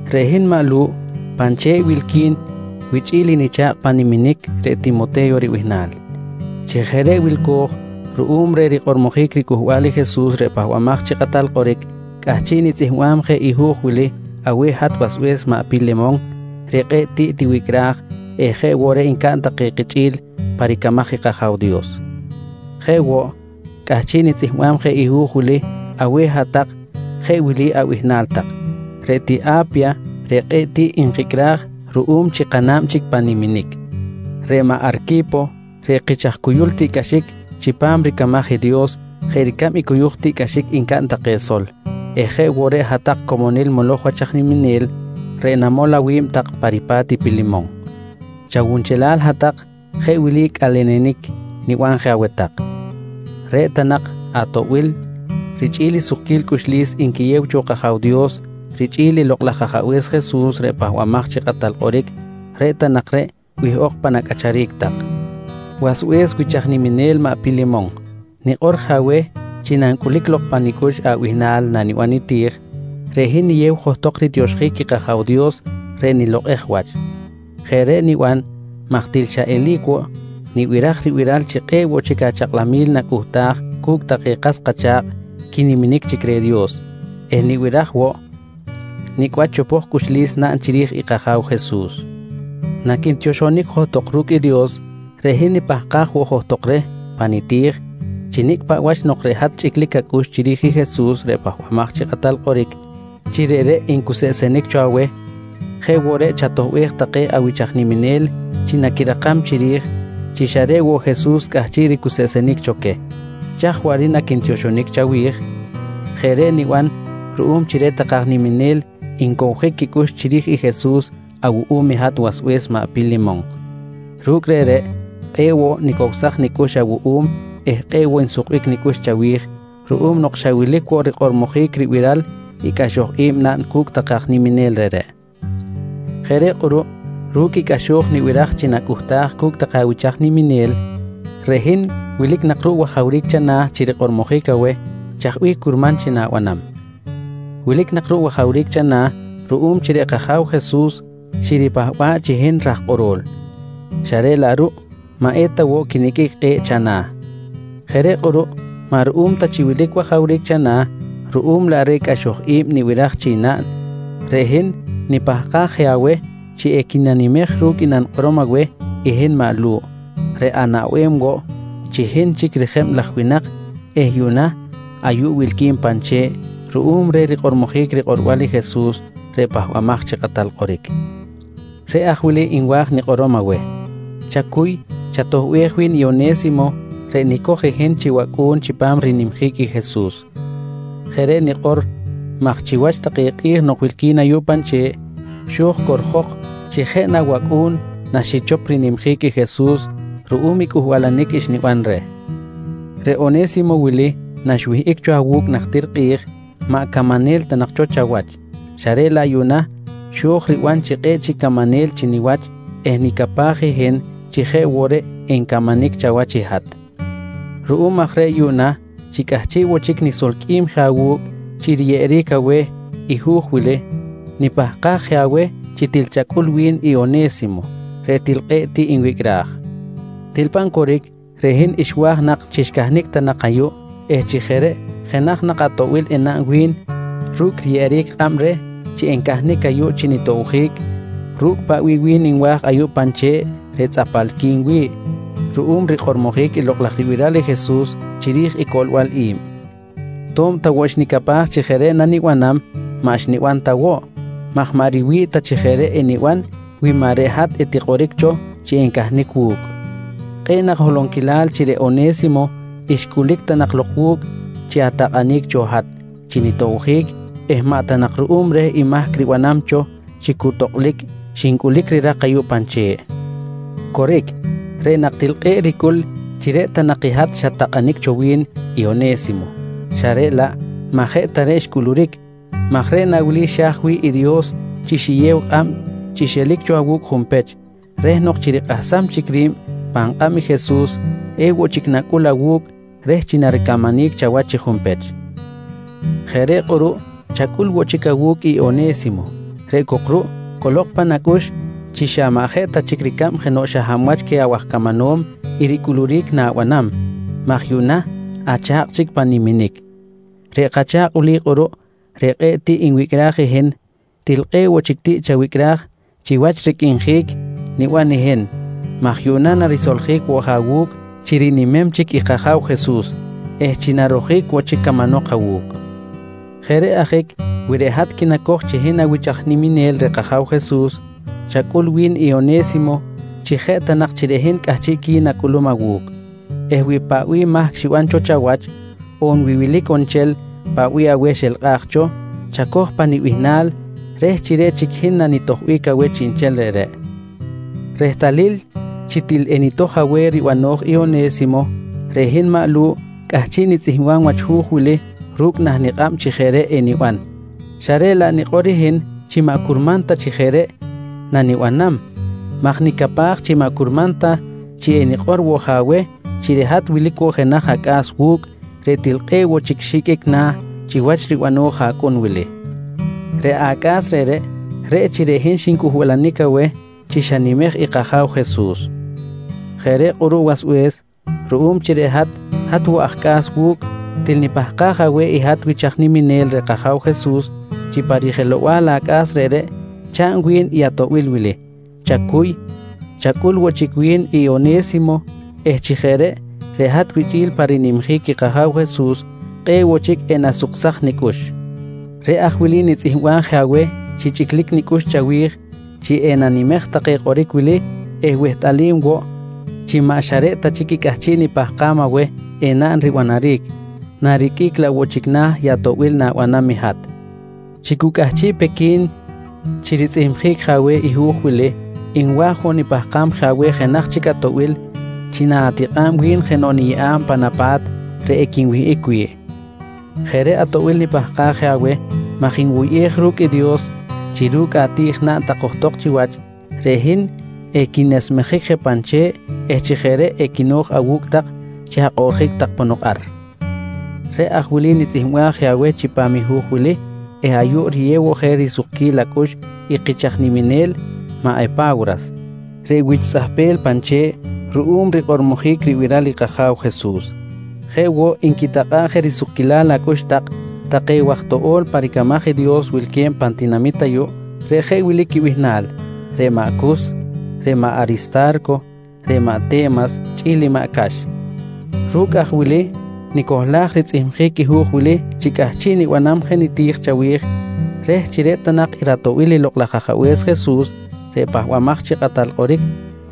Reꞌ hin maꞌ Lu̱ꞌ pan che̱ꞌ wilqui̱n wichꞌi̱l i nicha̱kꞌ pan niminic reꞌ Timote̱yo ribihnal. Chi jeꞌ reꞌ wilco̱j ruꞌum reh rikꞌormojic riCꞌuhbal i Jesus reꞌ Pahbamaj chi Kꞌatal Kꞌoric, cꞌahchiꞌ nitzꞌihmbam je i hu̱j wili aweh hat wasbe̱s maꞌ Pilemon reꞌ kꞌe̱ꞌ tiꞌ tiwicꞌraj eh jeꞌ woꞌ reꞌ ncaꞌn take kichꞌi̱l pa ricamaj i kAja̱w Dios. Jeꞌ woꞌ cꞌahchiꞌ nitzꞌihmbam je i hu̱j wili aweh hat-tak jeꞌ wili abihnal tak: Reꞌ tiꞌ A̱pya reꞌ kꞌe̱ꞌ tiꞌ nkicꞌraj ruꞌum chi kana̱b chic pan niminic, reꞌ maꞌ Arqui̱po reꞌ kich aj cuyul tiꞌcꞌaxic chipam ricamaj i Dios jeꞌ ricab i cuyuj tiꞌcꞌaxic ncaꞌn take sol eh jeꞌ woꞌ reꞌ hat-tak comonil moloj wach aj niminel reꞌ namol awi̱b tak pa ripa̱t i Pilemon. Chawunchelal hat-tak jeꞌ wili cꞌalenenic niban je aweh tak: Reꞌ ta nak atoꞌbil richꞌi̱l i sukquil cꞌuxlis nquiyew cho kAja̱w Dios richꞌi̱l i Lokꞌ laj Ajabe̱s Jesus reꞌ Pahbamaj chi Kꞌatal Kꞌoric, reꞌ ta nak reꞌ wihꞌok pan acꞌacharic tak. Wasbe̱s wich aj niminel maꞌ Pilemon, nikꞌor je aweh chi nancꞌulic lok pa nicꞌux abihnal naniban niti̱j, reꞌ hin niyew johtok ritioxjic i kAja̱w Dios reꞌ nilokꞌej wach. Jeꞌ reꞌ niban maj til xa eli̱c woꞌ nibiraj ribiral chi kꞌe̱ꞌ woꞌ chic achakꞌlamil nacꞌuhtaj cu̱cꞌ take kas kacha̱kꞌ quiniminic chic reh i Dios eh nibiraj woꞌ nicꞌ wach chopoj cꞌuxlis naꞌn chiri̱j i kAja̱w Jesus. Naquintioxonic johtok ru̱cꞌ i Dios, reꞌ hin nipahkaj woꞌ johtok reh pa niti̱j chi nicꞌ paꞌ wach nok reꞌ hat chꞌiclic acꞌux chiri̱j i Jesus reꞌ Pahbamaj chi Kꞌatal Kꞌoric chi reꞌreꞌ ncuseꞌsenic cho aweh, jeꞌ woꞌ reꞌ chatoꞌbej take awich aj niminel chi naquirakam chiri̱j chi xa reꞌ woꞌ Jesus cꞌahchiꞌ ricuseꞌsenic cho queh. Chaj waꞌric naquintioxonic chawi̱j? Jeꞌ reꞌ niban ruꞌum chi reꞌ take aj niminel ncowjic quicꞌux chiri̱j i Jesus awuꞌum i hat wasbe̱s maꞌ Pilemon. Ru̱cꞌ reꞌreꞌ, kꞌe̱ꞌ woꞌ nicowsaj nicꞌux awuꞌum eh kꞌe̱ꞌ woꞌ nsukbic nicꞌux chawi̱j ruꞌum nok xa wilic woꞌ rikꞌormojic ribiral i cꞌaxo̱j naꞌn cu̱cꞌ take aj niminel reꞌreꞌ. Jeꞌ reꞌ kꞌuruꞌ, ru̱cꞌ i cꞌaxo̱j nibiraj chi nacꞌuhtaj cu̱cꞌ take awich aj niminel, reꞌ hin wilic nak ruꞌ wajawric chana̱ chi rikꞌormojic aweh chaj bih curman chi na̱banam. Wilic nak ruꞌ wajawric chana̱ ruꞌum chi reꞌ kAja̱w Jesus xiripahba̱ꞌ chi hin raj kꞌoro̱l, xa reꞌ laꞌ ruꞌ maꞌ eta woꞌ quiniqꞌuic kꞌe̱ꞌ chana̱. Jeꞌ reꞌ kꞌuruꞌ maꞌ ruꞌum ta chi wilic wajawric chana̱, ruꞌum laꞌ reh cꞌaxoj i̱b nibiraj chi naꞌn, reꞌ hin nipahkaj je aweh chi equinanimej ru̱cꞌ i nanikꞌorom aweh i hin maꞌ Lu̱ꞌ reꞌ anaꞌbem woꞌ chi hin chic rijeb laj winak eh chi yuꞌna ayuꞌ wilqui̱n pan che̱ꞌ ruꞌum reh rikꞌormojic rikꞌorbal i Jesus reꞌ Pahbamaj chi Kꞌatal Kꞌoric. Reꞌ aj wili nwa̱j nikꞌorom aweh: Chacuy, chatoꞌbej wi̱n i One̱simo reꞌ nicoj i hin chi wacꞌu̱n chipam rinimjic i Jesus. Jeꞌ reꞌ nikꞌor maj chiwach take kꞌi̱j nok wilqui̱n ayuꞌ pan che̱ꞌ, xo̱j corjok chi jeꞌ na wacꞌu̱n naxichop rinimjic i Jesus ru̱cꞌ i cꞌuhbalanic xniban reh. Reꞌ One̱simo wili naxwihꞌic cho awu̱cꞌ najtir kꞌi̱j, maꞌ camanel ta nak cho chawach xa reꞌ laꞌ yuꞌna xo̱j riban chi kꞌe̱ꞌ chic camanel chi niwach eh nicapaj hin chi jeꞌ woꞌ reꞌ encamanic chawach i hat. Ruꞌum aj reꞌ yuꞌna chi cꞌahchiꞌ woꞌ chic nisolqꞌuim je awu̱cꞌ chi riyeꞌeric aweh i hu̱j wili, nipahkaj je aweh chi til chacꞌul wi̱n i One̱simo reꞌ til kꞌe̱ꞌ tiꞌ nwicꞌraj. Til pan coric, reꞌ hin xwa̱j nak chi xcahnic ta nak ayuꞌ eh chi jeꞌ reꞌ jenaj nak atoꞌbil enaꞌn wi̱n ru̱cꞌ riyeꞌeric kꞌab reh chi encahnic ayuꞌ chi nitobjic ru̱cꞌ paꞌ bih wi̱n nwa̱j ayuꞌ pan che̱ꞌ reꞌ tzꞌapalqui̱n wi̱ꞌ ruꞌum rikꞌormojic i lokꞌ laj ribiral i Jesus chiri̱j i coꞌlbal i̱b. To̱b ta woꞌ xnicapaj chi jeꞌ reꞌ nanibanam, maꞌ xniban ta woꞌ maj maꞌ riwi̱ꞌ ta chi jeꞌ reꞌ eniban wi maꞌ reꞌ hat etikꞌoric cho chi encahnic wu̱cꞌ. Kꞌe̱ꞌ nak holonquilal chi reꞌ One̱simo xcꞌulic ta nak lok wu̱cꞌ chi atakꞌanic cho hat chi nitobjic eh maꞌ ta nak ruꞌum reh i mahc ribanam cho chi cu tokꞌlic xincꞌulic rirak ayuꞌ pan che̱ꞌ. Coric, reꞌ nak til kꞌe̱ꞌ ricꞌul chi reꞌ ta nak i hat xat-takꞌanic cho wi̱n i One̱simo, xa reꞌ laꞌ maꞌ jeꞌ ta reꞌ xcꞌuluric maj reꞌ na wili xa̱j wi̱ꞌ i Dios chi xiyew kꞌab chi xelic cho awu̱cꞌ junpech, reh nok chi rikꞌahsam chic ri̱b pan kꞌab i Jesus, ewoꞌ chic nacꞌul awu̱cꞌ reh chi naricamanic chawach chi junpech. Jeꞌ reꞌ kꞌuruꞌ chacꞌul woꞌ chic awu̱cꞌ i One̱simo reꞌ cok ruꞌ cꞌolok pan acꞌux chi maꞌ xa jeꞌ ta chic ricab jenoꞌ xa hab wach queh awaj camanom i ricꞌuluric na̱banam maj yuꞌna acha̱kꞌ chic pan niminic. Reꞌ kacha̱kꞌ wili kꞌuruꞌ reꞌ kꞌe̱ꞌ tiꞌ nwicꞌraj i hin, til kꞌe̱ꞌ woꞌ chic tiꞌ chawicꞌraj chiwach ricꞌrinjic niban i hin maj yuꞌna narisoljic je awu̱cꞌ chi rinimem chic i kAja̱w Jesus eh chi narojic woꞌ chic camanok awu̱cꞌ. Jeꞌ reꞌ ajic wi reꞌ hat quinacoj chi hin awich niminel reh kAja̱w Jesus, chacꞌul wi̱n i One̱simo chi jeꞌ ta nak chi reꞌ hin cꞌahchiꞌqui̱n acꞌulum awu̱cꞌ eh wi paꞌ bih mahc xiban cho chawach on wi wilic on nchel paꞌ bih aweh xelkꞌaj cho, chacoj pa nibihnal chi reꞌ chic hin nanitojbic aweh chiꞌnchel reꞌreꞌ. Rehtalil chi til enitoj aweh ribano̱j i One̱simo, reꞌ hin maꞌ Lu̱ꞌ cꞌahchiꞌ nitzꞌihmbam wach hu̱j wili ru̱cꞌ nah nikꞌab chi jeꞌ reꞌ eniban xa reꞌ laꞌ nikꞌor hin chi maꞌ curman ta chi jeꞌ reꞌ nanibanam maj nicapaj chi maꞌ curman ta chi enikꞌor woꞌ je aweh chi reꞌ hat wilic woꞌ jenaj acꞌa̱s wu̱cꞌ reꞌ til kꞌe̱ꞌ woꞌ chic xiqꞌuic na̱ chiwach ribano̱j acꞌun wili. Reꞌ acꞌa̱s reꞌreꞌ, reꞌ chi reꞌ hin xincꞌuhbalanic aweh chi xanimej i kAja̱w Jesus. Jeꞌ reꞌ kꞌuruꞌ wasbe̱s ruꞌum chi reꞌ hat, hat woꞌ aj cꞌa̱s wu̱cꞌ til nipahkaj aweh i hat wich aj niminel reh kAja̱w Jesus, chi pa rijelow-bal acꞌa̱s reꞌreꞌ chaꞌn wi̱n i atoꞌbil wili: Chacuy, chacꞌul woꞌ chic wi̱n i One̱simo eh chi jeꞌ reꞌ, reꞌ hat wichꞌi̱l pa rinimjic i kAja̱w Jesus, kꞌe̱ꞌ woꞌ chic enasuksaj nicꞌux. Reꞌ aj wili nitzꞌihmbaj je aweh chi chꞌiclic nicꞌux chawi̱j chi enanimej take kꞌoric wili eh wehtꞌalim woꞌ chi maꞌ xa reꞌ ta chic i cꞌahchiꞌ nipahkam aweh enaꞌn ribanaric, nariqꞌuic laꞌ woꞌ chic na̱ i atoꞌbil na̱banam i hat. Chi cu cꞌahchiꞌ pe qui̱n chi ritzꞌihmjic je aweh i hu̱j wili, nwa̱j woꞌ nipahkam je aweh jenaj chic atoꞌbil chi na̱tikꞌa̱b wi̱n jenoꞌ niyeꞌa̱b pan apa̱t reꞌ equinwihꞌic wi̱ꞌ. Jeꞌ reꞌ atoꞌbil nipahkaj je aweh maj nwuyꞌej ru̱cꞌ i Dios chi ru̱cꞌ ati̱j naꞌn tak johtok chiwach, reꞌ hin equinesmejic je pan che̱ꞌ eh chi jeꞌ reꞌ equino̱j awu̱cꞌ tak chi akꞌoꞌrjic tak ponok ar. Reꞌ aj wili nitzꞌihmbaj je aweh chipam i hu̱j wili eh ayuꞌ riyew woꞌ je risukquil acꞌux i kich aj niminel maꞌ Epa̱wras, reꞌ wich tzꞌahpel pan che̱ꞌ ruꞌum reh rikꞌormojic ribiral kAja̱w Jesus. Jeꞌ woꞌ nquitakꞌa̱ꞌ je risukquilal acꞌux tak take waj toꞌo̱l pa ricamaj i Dios wilque̱b pan tinamit ayuꞌ, reꞌ jeꞌ wili quibihnal: Reꞌ maꞌ Cus, reꞌ maꞌ Arista̱rco, reꞌ maꞌ Te̱mas chꞌi̱l i maꞌ Cax. Ru̱cꞌ aj wili nicohlaj ritzꞌihmjic i hu̱j wili chi cꞌahchiꞌ nibanam je niti̱j chawi̱j, reh chi reꞌ ta nak i ratoꞌbil i Lokꞌ laj Ajabe̱s Jesus reꞌ Pahbamaj chi Kꞌatal Kꞌoric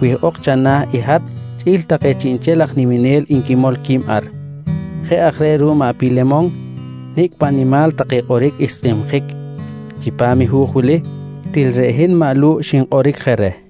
wihꞌok chana̱ i hat chꞌi̱l take chiꞌnchel aj niminel nquimol qui̱b ar. Jeꞌ aj reꞌ ruꞌ maꞌ Pilemon, nicꞌ paꞌ nimal take kꞌoric xtzꞌihmjic chipam hu̱j wili, til reꞌ hin maꞌ Lu̱ꞌ xinkꞌoric je reh.